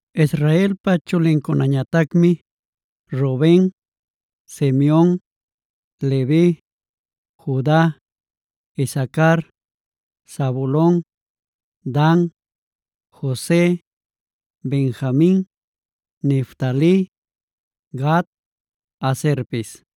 Israelpa chulincunañatacmi: Ruben, Simeon, Levi, Juda, Isacar, Zabulon, Dan, Jose, Benjamin, Neftali, Gad, Aserpis.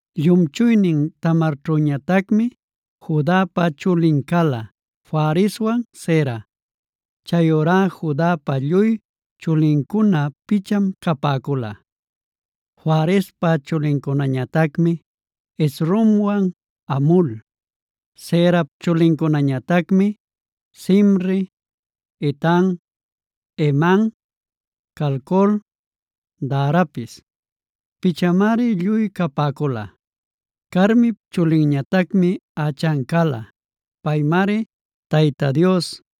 Llumchuynin Tamarćhüñatacmi Judapa chulin cala: Fareswan Zera. Chayurá Judapa lluy chulincuna picham capäcula. Farespa chulincunañatacmi Hezronwan Hamul. Zerap chulincunañatacmi: Zimri, Etan, Heman, Calcol, Darapis. Pichamari lluy capäcula. Carmip chulinñatacmi Achan cala. Paymari Tayta Dios: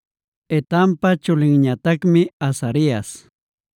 Etanpa chulinñatacmi Azarias.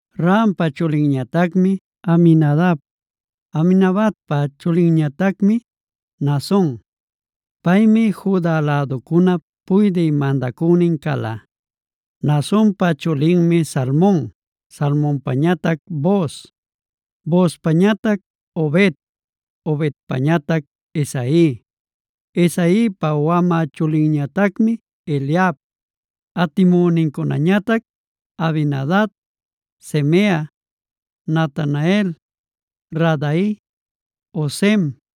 Rampa chulinñatacmi Aminadab. Aminadabpa chulinñatacmi Naason. Paymi Juda läducunap puydï mandacünin cala. Naasonpa chulinmi Salmon, Salmonpañatac Booz, Boozpañatac Obed, Obedpañatac Isai, Isaipa wamä chulinñatacmi Eliab; atimünincunañatac Abinadab, Simea, Natanael, Radai, Ozem,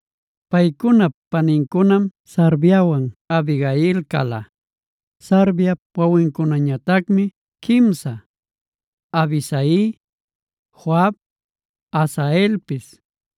Paycunap panincunam Sarviawan Abigail cala. Sarviap wawincunañatacmi quimsa: Abisai, Joab, Asaelpis.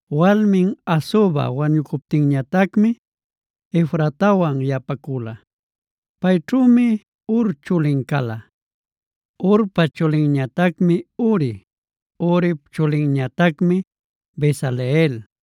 Walmin Azuba wañucuptinñatacmi Efratawan yapacula. Payćhümi Hur chulin cala. Hurpa chulinñatacmi Uri. Urip chulinñatacmi Bezaleel.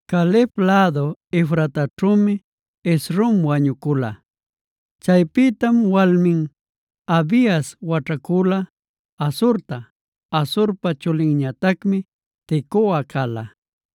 Caleb lädu Efrataćhümi Hezron wañucula. Chaypïtam walmin Abias waćhacula Asurta. Asurpa chulinñatacmi Tecoa cala.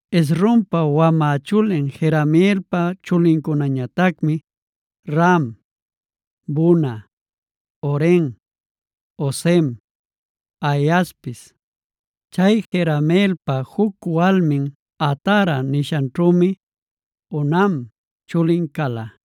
Hezronpa wamä chulin Jerameelpa chulincunañatacmi: Ram, Buna, Oren, Ozem, Ahiaspis. Chay Jerameelpa juc walmin Atara nishanćhümi Onam chulin cala.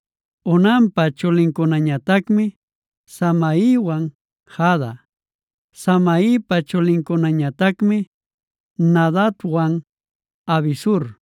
Onampa chulincunañatacmi Samaiwan Jada. Samaipa chulincunañatacmi Nadabwan Abisur.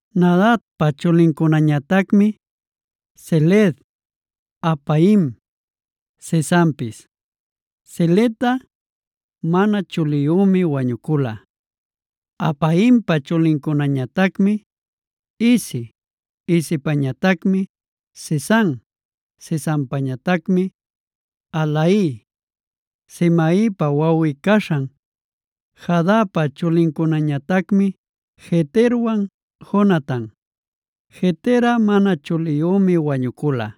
Nadabpa chulincunañatacmi: Seled, Apaim, Sesanpis. Seledꞌa mana chuliyümi wañucula. Apaimpa chulinñatacmi Isi, Isipañatacmi Sesan, Sesanpañatacmi Ahlai. Samaipa wawꞌi-caśhan Jadapa chulincunañatacmi Jeterwan Jonatan. Jeterꞌa mana chuliyümi wañucula.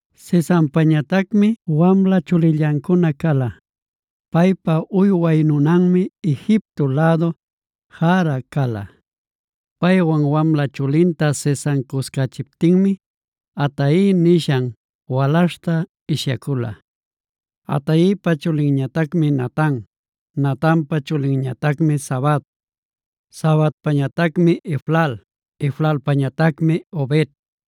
Sesanpañatacmi wamla chulillancuna cala. Paypa uyway nunanmi Egipto lädu Jarha cala. Paywan wamla chulinta Sesan cuscächiptinmi Atai nishan walaśhta ishyacula. Ataipa chulinñatacmi Natan. Natanpa chulinñatacmi Zabad, Zabadpañatacmi Eflal, Eflalpañatacmi Obed,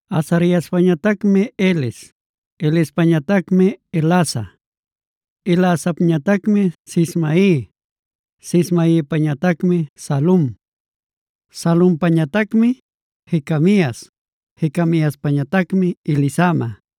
Azariaspañatacmi Heles, Helespañatacmi Elasa, Elasapñatacmi Sismai, Sismaipañatacmi Salum, Salumpañatacmi Jecamias, Jecamiaspañatacmi Elisama.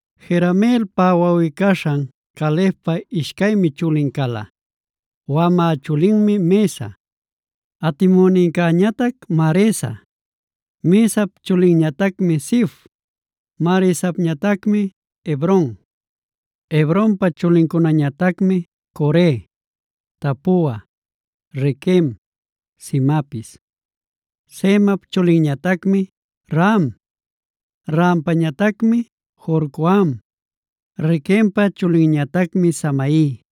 Jerameelpa wawꞌi-caśhan Calebpa ishcaymi chulin cala. Wamä chulinmi Mesa, atimünincäñatac Maresa. Mesap chulinñatacmi Zif, Maresapñatacmi Hebron. Hebronpa chulincunañatacmi: Core, Tapua, Requem, Semapis. Semap chulinñatacmi Raham, Rahampañatacmi Jorcoam. Requempa chulinñatacmi Samai,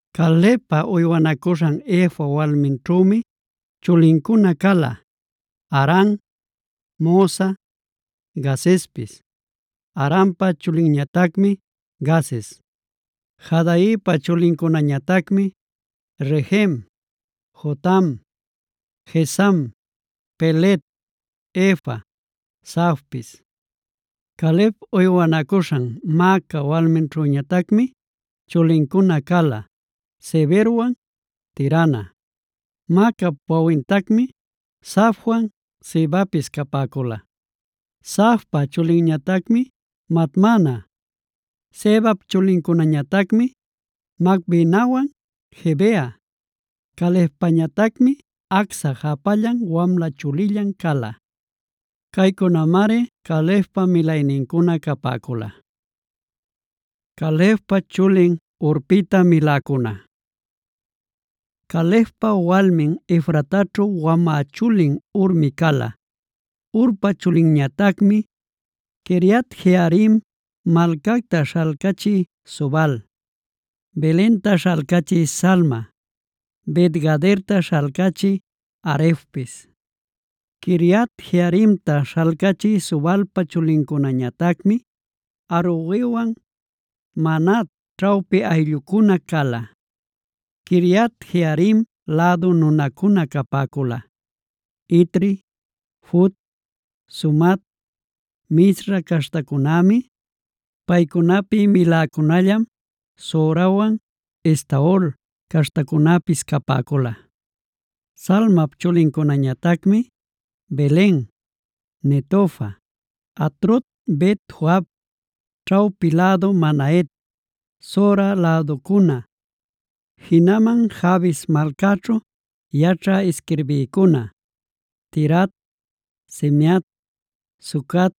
Calebpa uywanacuśhan Efa walminćhümi chulincuna cala: Haran, Mosa, Gazezpis. Haranpa chulinñatacmi Gazez. Jahdaipa chulincunañatacmi: Regem, Jotam, Gesam, Pelet, Efa, Saafpis. Caleb uywanacuśhan Maaca walminćhüñatacmi chulincuna cala Seberwan Tirhana. Maacap wawintacmi Saafwan Sevapis capäcula. Saafpa chulinñatacmi Madmana. Sevap chulincunañatacmi Macbenawan Gibea. Calebpañatacmi Acsa japallan wamla chulillan cala. Caycunamari Calebpa milaynincuna capäcula. Calebpa chulin Hurpïta miläcuna Calebpa walmin Efrataćhu wamä chulin Hurmi cala. Urpa chulinñatacmi Quiriat-jearim malcacta śhalcachï Sobal, Belenta śhalcachï Salma, Bet-gaderta śhalcachï Harefpis. Quiriat-jearimta śhalcachï Sobalpa chulincunañatacmi Haroewan Manahat ćhawpi ayllucuna cala. Quiriat-jearim lädu nunacuna capäcula: Itri, Fut, Sumat, Misra caśhtacunämi. Paycunapi miläcunallam Zorawan Estaol caśhtacunäpis capäcula. Salmap chulincunañatacmi: Belen, Netofa, Atrot-bet-joab, ćhawpi lädu Manahet, Zora läducuna, jinaman Jabes malcaćhu yaćhä isquirbïcuna, Tirat, Simeat, Sucat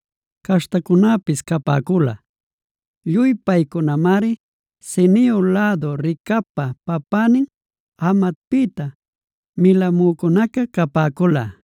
caśhtacunäpis capäcula. Lluy paycunamari Ceneo lädu Recabpa papänin Hamatpïta milamücunaca capäcula.